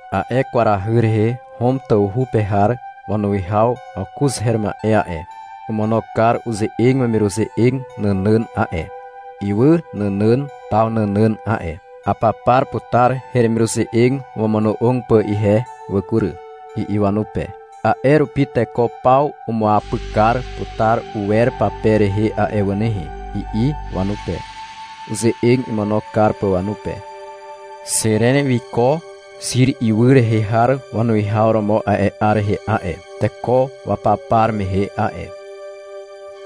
A'e kwarahy rehe Hom tawhu pe har wanuwihaw Awkuz her ma'e a'e, omono kar uze'eg wemiruze'eg nànàn a'e, ywy nànàn taw nànàn a'e. — Apapar putar heremiruze'eg wamono'og pà ihe wà kury, i'i wanupe. — A'e rupi teko paw umuapyk kar putar uwer pape rehe a'e wà nehe, i'i wanupe, uze'eg imono kar pà wanupe. Xiren wiko Xir ywy rehe har wanuwihaw romo a'e 'ar rehe a'e, teko wapapar mehe a'e.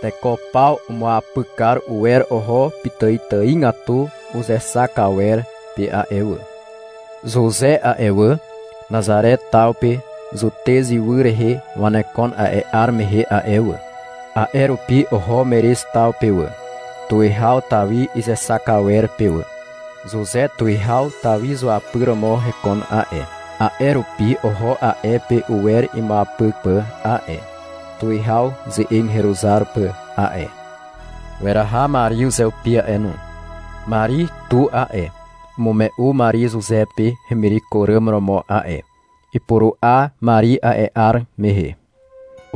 Teko paw umuapyk kar uwer oho pitàitàigatu uzexak awer pe a'e wà. Zuze a'e wà, Nazare taw pe Zutez ywy rehe wanekon a'e 'ar mehe a'e wà. A'e rupi oho Merez taw pe wà, tuwihaw Tawi izexak awer pe wà. Zuze tuwihaw Tawi zuapyr romo hekon a'e, a'e rupi oho a'e pe uwer imuapyk pà a'e, tuwihaw ze'eg heruzar pà a'e. Weraha Mari uzeupi a'e no. Mari tu a'e, umume'u Mari Zuze pe hemireko ràm romo a'e. Ipuru'a Mari a'e 'ar mehe.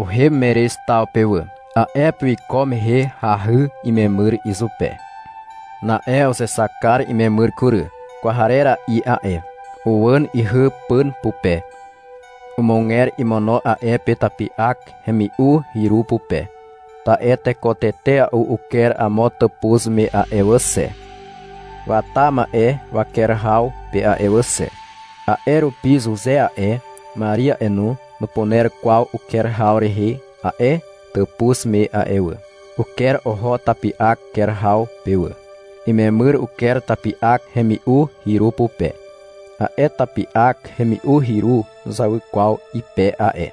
Uhem Merez taw pe wà. A'e pe wiko mehe hahy imemyr izupe. Na'e uzexak kar imemyr kury. Kwarera'i a'e. Uwàn ihy pàn pupe. Umuger imono a'e pe tapi'ak hemi'u hyru pupe. Ta'e teko tetea'u uker amo tàpuz me a'e wà xe, wata ma'e waker haw pe a'e wà xe. A'e rupi Zuze a'e, Mari a'e no, nupuner kwaw uker haw rehe a'e tàpuz me a'e wà. Uker oho tapi'ak ker haw pe wà. Imemyr uker tapi'ak hemi'u hyru pupe. A'e tapi'ak hemi'u hyru nuzawy kwaw ype a'e.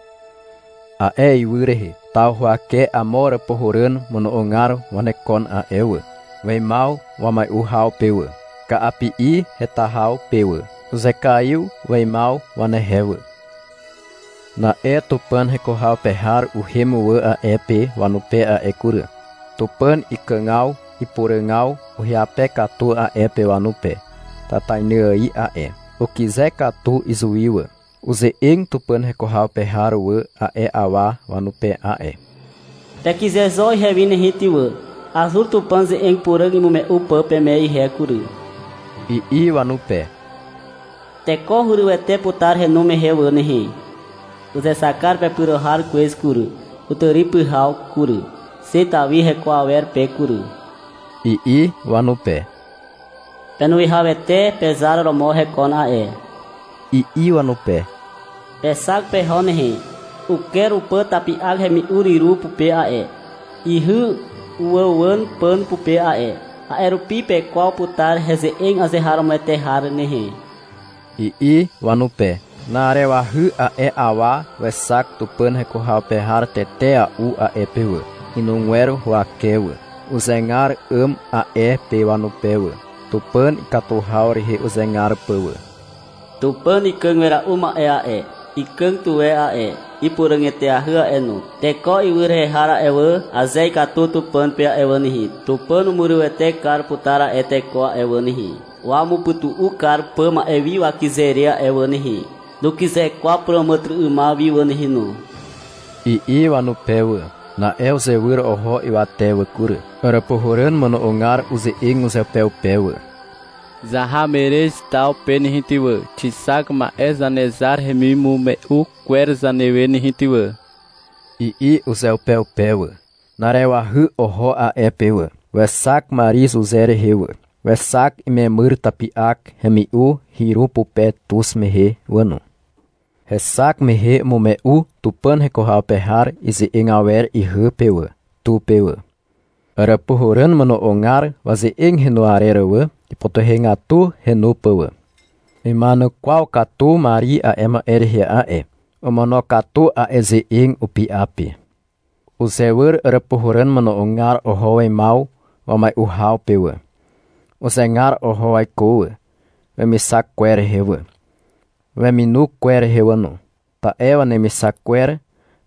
A'e ywy rehe, taw huwake amo àràpuhàràn mono'ogar wanekon a'e wà, weimaw wamai'u haw pe wà, ka'api'i heta haw pe wà. Uzekaiw weimaw wanehe wà. Na'e Tupàn heko haw pe har uhem wà a'e pe wanupe a'e kury. Tupàn ikàgaw ipuràgaw uhyape katu a'e pe wanupe tatainy ài a'e. Ukyze katu izuwi wà. Uze'eg Tupàn heko haw pe har wà a'e awa wanupe a'e. — Pekyze zo ihewi nehe ty wà. Azur Tupàn ze'eg puràg imume'u pà peme ihe kury, i'i wanupe. — Teko hurywete putar henu mehe wà nehe. — Uzexak kar pepyro har kwez kury, kutàri pyhaw kury, xe Tawi heko awer pe kury, i'i wanupe. — Penuwihawete pezar romo hekon a'e, i'i wanupe. — Pexak peho nehe. Uker upà tapi'ak hemi'u hyru pupe a'e. Ihy uwàuwàn pàn pupe a'e. A'e rupi pekwaw putar heze'eg azeharomoete har nehe, i'i wanupe. Na'arewahy a'e awa wexak Tupàn heko haw pe har tetea'u a'e pe wà, inugwer huwake wà. Uzegar 'àm a'e pe wanupe wà. Tupàn ikatu haw rehe uzegar pà wà. — Tupàn Ikàg Wera'u Ma'e a'e, ikàg tuwe a'e, ipuràg eteahy a'e no. Teko ywy rehe har a'e wà, aze ikatu Tupàn pe a'e wà nehe, Tupàn umurywete kar putar a'e teko a'e wà nehe, wamupytu'u kar pà ma'e wi wakyze re a'e wà nehe. Nukyze kwaw puràmàtyry'ymaw wi wà nehe no, i'i wanupe wà. Na'e uzewyr oho ywate wà kury. Àràpuhàràn mono'ogar uze'eg uzeupeupe wà. — Zaha Merez taw pe nehe ty wà, xixak ma'e Zanezar hemimume'u kwer zanewe nehe ty wà, i'i uzeupeupe wà. Na'arewahy oho a'e pe wà. Wexak Mari Zuze rehe wà. Wexak imemyr tapi'ak hemi'u hyru pupe tuz mehe wà no. Hexak mehe umume'u Tupàn heko haw pe har ize'eg awer ihy pe wà, tu pe wà. Àràpuhàràn mono'ogar waze'eg henu arer wà, ipytuhegatu henu pà wà. Ima'enukwaw katu Mari a'e ma'e rehe a'e. Omonokatu a'e ze'eg upy'a pe. Uzewyr àràpuhàràn mono'ogar oho weimaw wamai'u haw pe wà. Uzegar oho waiko wà, wemixak kwer rehe wà, weminu kwer rehe wà no. Ta'e wanemixak kwer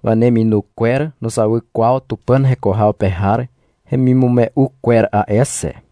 waneminu kwer nuzawy kwaw Tupàn heko haw pe har hemimume'u kwer a'e xe.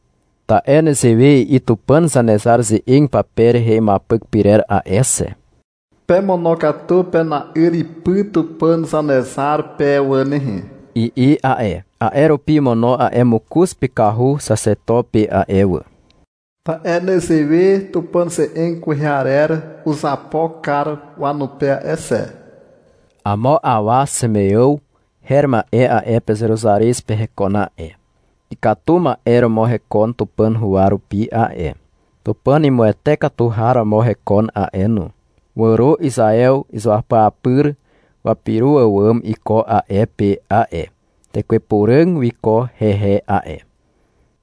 Ta'e nezewe i'i Tupàn Zanezar ze'eg pape rehe imuapyk pyrer a'e xe. — Pemonokatu pena'yr ipy Tupàn Zanezar pe wà nehe, i'i a'e. A'e rupi omono a'e mokoz pykahu xaxeto pe a'e wà. Ta'e nezewe Tupàn ze'eg kwehe arer uzapo kar wanupe a'e xe. Amo awa Ximeàw her ma'e a'e pe Zeruzarez pe hekon a'e. Ikatu ma'e romo hekon Tupàn huwa rupi a'e. Tupàn imuwete katu har romo hekon a'e no. Wàro Izaew izuapyapyr wapyro àwàm iko a'e pe a'e. Tekwe Puràg wiko hehe a'e.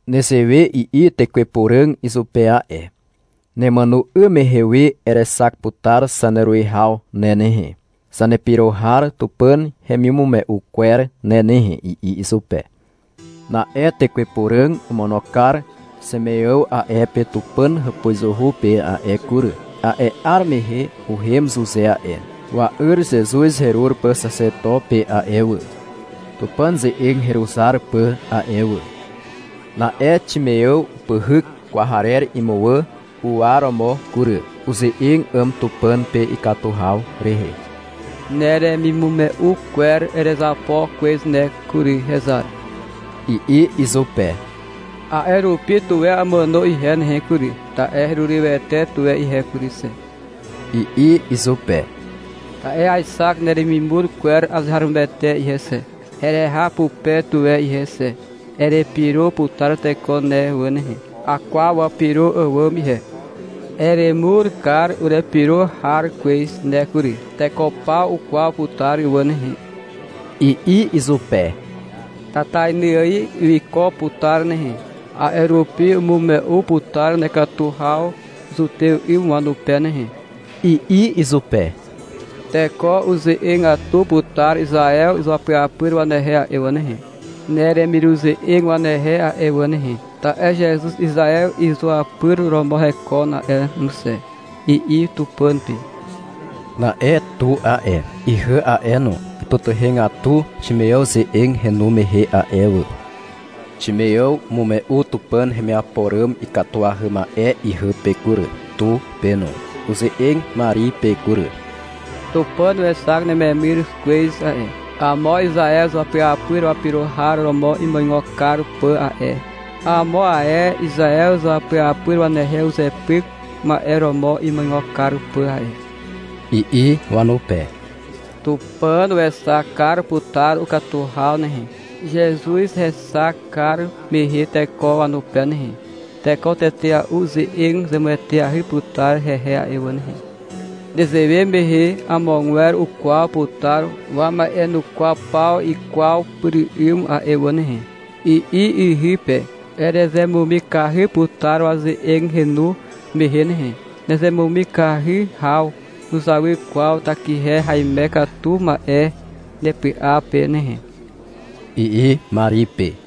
Nezewe i'i Tekwe Puràg izupe a'e. — Nemàno 'ym mehe we erexak putar zaneruwihaw ne nehe, zanepyro har Tupàn hemimume'u kwer ne nehe, i'i izupe. Na'e Tekwe Puràg omono kar Ximeàw a'e pe Tupàn hàpuzuhu pe a'e kury. A'e 'ar mehe uhem Zuze a'e, wa'yr Zezuz herur pà xaxeto pe a'e wà, Tupàn ze'eg heruzar pà a'e wà. Na'e Ximeàw upyhyk kwarer imuwà u'uwaromo kury. Uze'eg 'àm Tupàn pe ikatu haw rehe. — Neremimume'u kwer erezapo kwez ne kury, hezar, i'i izupe. — A'e rupi, tuwe amàno ihe nehe kury, ta'e herurywete tuwe ihe kury xe, i'i izupe. — Ta'e aexak neremimur kwer azeharomoete ihe xe, hereha pupe tuwe ihe xe. Erepyro putar teko ne wà nehe. Akwaw wapyro àwàm ihe, — Eremur kar urepyro har kwez ne kury. Teko paw ukwaw putar wà nehe, i'i izupe. — Tatainy ài wiko putar nehe. A'e rupi umume'u putar nekatu haw Zutew 'ym wanupe nehe, i'i izupe. — Teko uze'egatu putar Izaew izuapyapyr wanehe a'e wà nehe, neremiruze'eg wanehe a'e wà nehe, ta'e Zezuz Izaew izuapyr romo hekon a'e no xe, i'i Tupàn pe. Na'e tu a'e, ihy a'e no, ipytuhegatu Ximeàw ze'eg henu mehe a'e wà. Ximeàw umume'u Tupàn hemiapo ràm ikatuahy ma'e ihy pe kury, tu pe no. Uze'eg Mari pe kury. Tupàn wexak nememyr kwez a'e, amo Izaew izuapyapyr wapyro har romo imuigo kar pà a'e, amo ae Izaew izuapyapyr wanehe uzepyk ma'e romo imuigo kar pà a'e, i'i wanupe. — Tupàn wexak kar putar ukatu haw nehe, Zezuz hexak kar mehe teko wanupe nehe. Teko tetea'u uze'eg zemueteahy putar hehe a'e wà nehe. Nezewe mehe amogwer ukwaw putar wama'enukwaw paw ikwaw pyr 'ym a'e wà nehe, i'i ihy pe. Erezemumikahy putar waze'eg henu mehe nehe. Nezemumikahy haw nuzawy kwaw takihe haime katu ma'e nepy'a pe nehe, i'i Mari pe.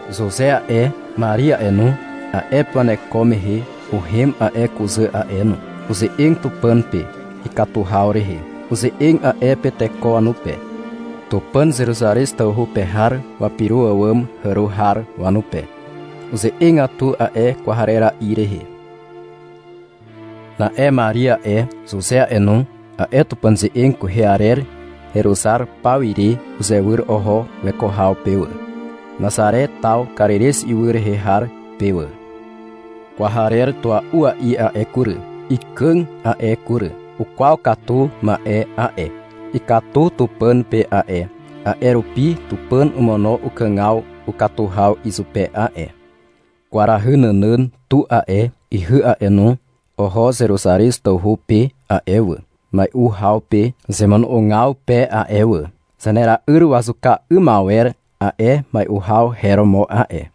Zuze a'e, Mari a'e no, a'e pe waneko mehe, uhem a'e kuzà a'e no. Uze'eg Tupàn pe, ikatu haw rehe. Uze'eg a'e pe teko wanupe, Tupàn Zeruzarez tawhu pe har wapyro àwàm hàro har wanupe. Uze'egatu a'e kwarera'i rehe. Na'e Mari a'e, Zuze a'e no, a'e Tupàn ze'eg kwehe arer heruzar paw ire uzewyr oho weko haw pe wà, Nazare taw Karirez ywy rehe har pe wà. Kwarer tua'ua'i a'e kury, ikàg a'e kury. Ukwaw katu ma'e a'e. Ikatu Tupàn pe a'e, a'e rupi Tupàn omono ukàgaw ukatu haw izupe a'e. Kwarahy nànàn tu a'e, ihy a'e no, oho Zeruzarez tawhu pe a'e wà, mai'u haw pe zemono'ogaw pe a'e wà. Zanera'yr wazuka 'ym awer a'e mai'u haw her romo a'e.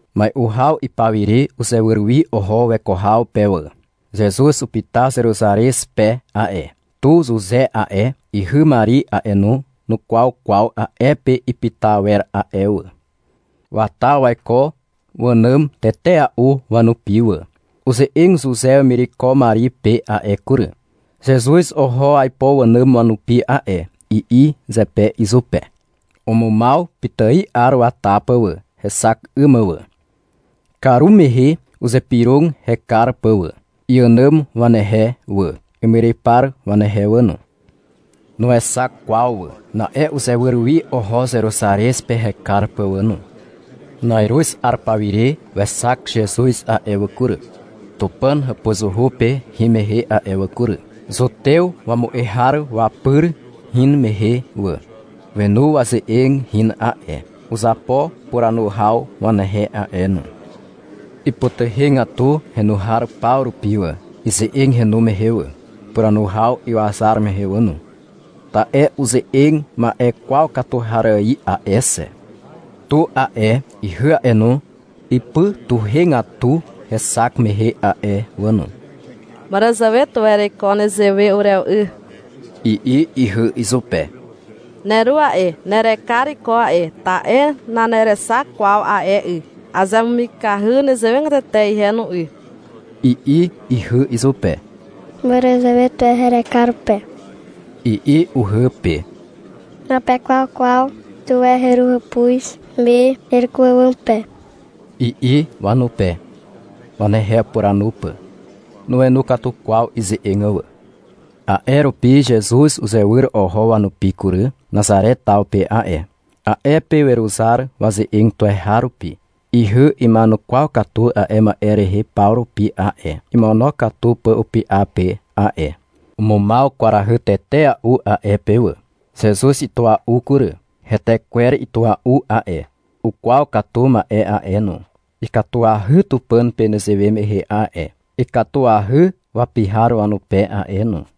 Mai'u haw ipawire uzewyr wi oho weko haw pe wà. Zezuz upyta Zeruzarez pe a'e. Tu Zuze a'e, ihy Mari a'e no, nukwaw kwaw a'e pe ipyta awer a'e wà. Wata waiko wànàm tetea'u wanupi wà. Uze'eg Zuze wemireko Mari pe a'e kury. — Zezuz oho aipo wànàm wanupi a'e, i'i zepe izupe. Umumaw pitài 'ar wata pà wà, hexak 'ym mà wà. Karumehe uzypyrog hekar pà wà, iànàm wanehe wà, imyrypar wanehe wà no. Nuexak kwaw wà. Na'e uzewyr wi oho Zeruzarez pe hekar pà wà no. Na'iruz 'ar pawire wexak Zezuz a'e wà kury, Tupàn hàpuzuhu pe hin mehe a'e wà kury, Zutew wamu'e har wapyr hin mehe wà. Wenu waze'eg hin a'e. Uzapo puranu haw wanehe a'e no. Ipytuhegatu henu har paw rupi wà, ize'eg henu mehe wà, puranu haw iwazar mehe wà no. Ta'e uze'eg ma'e kwaw katu har ài a'e xe. Tu a'e, ihy a'e no, ipytuhegatu hexak mehe a'e wà no. — Màràzàwe tuwe ereiko nezewe urewe 'y, i'i ihy izupe. — Neru a'e, nerekar iko a'e, ta'e nanerexak kwaw a'e 'y. Azemumikahy nezewegatete ihe no 'y, i'i ihy izupe. — Màràzàwe tuwe herekar pe, i'i uhy pe. — Napekwaw kwaw tuwe heru hàpuz me hereko àwàm pe, i'i wanupe, wanehe upuranu pà. Nuenu katu kwaw ize'eg wà. A'e rupi Zezuz uzewyr oho wanupi kury, Nazare taw pe a'e. A'e pe weruzar waze'eg tuweharupi. Ihy ima'enukwaw katu a'e ma'e rehe paw rupi a'e, imonokatu pà upy'a pe a'e. Umumaw kwarahy tetea'u a'e pe wà. Zezuz itua'u kury. Hetekwer itua'u a'e. Ukwaw katu ma'e a'e no, ikatuahy Tupàn pe nezewe mehe a'e, ikatuahy wapi har wanupe a'e no.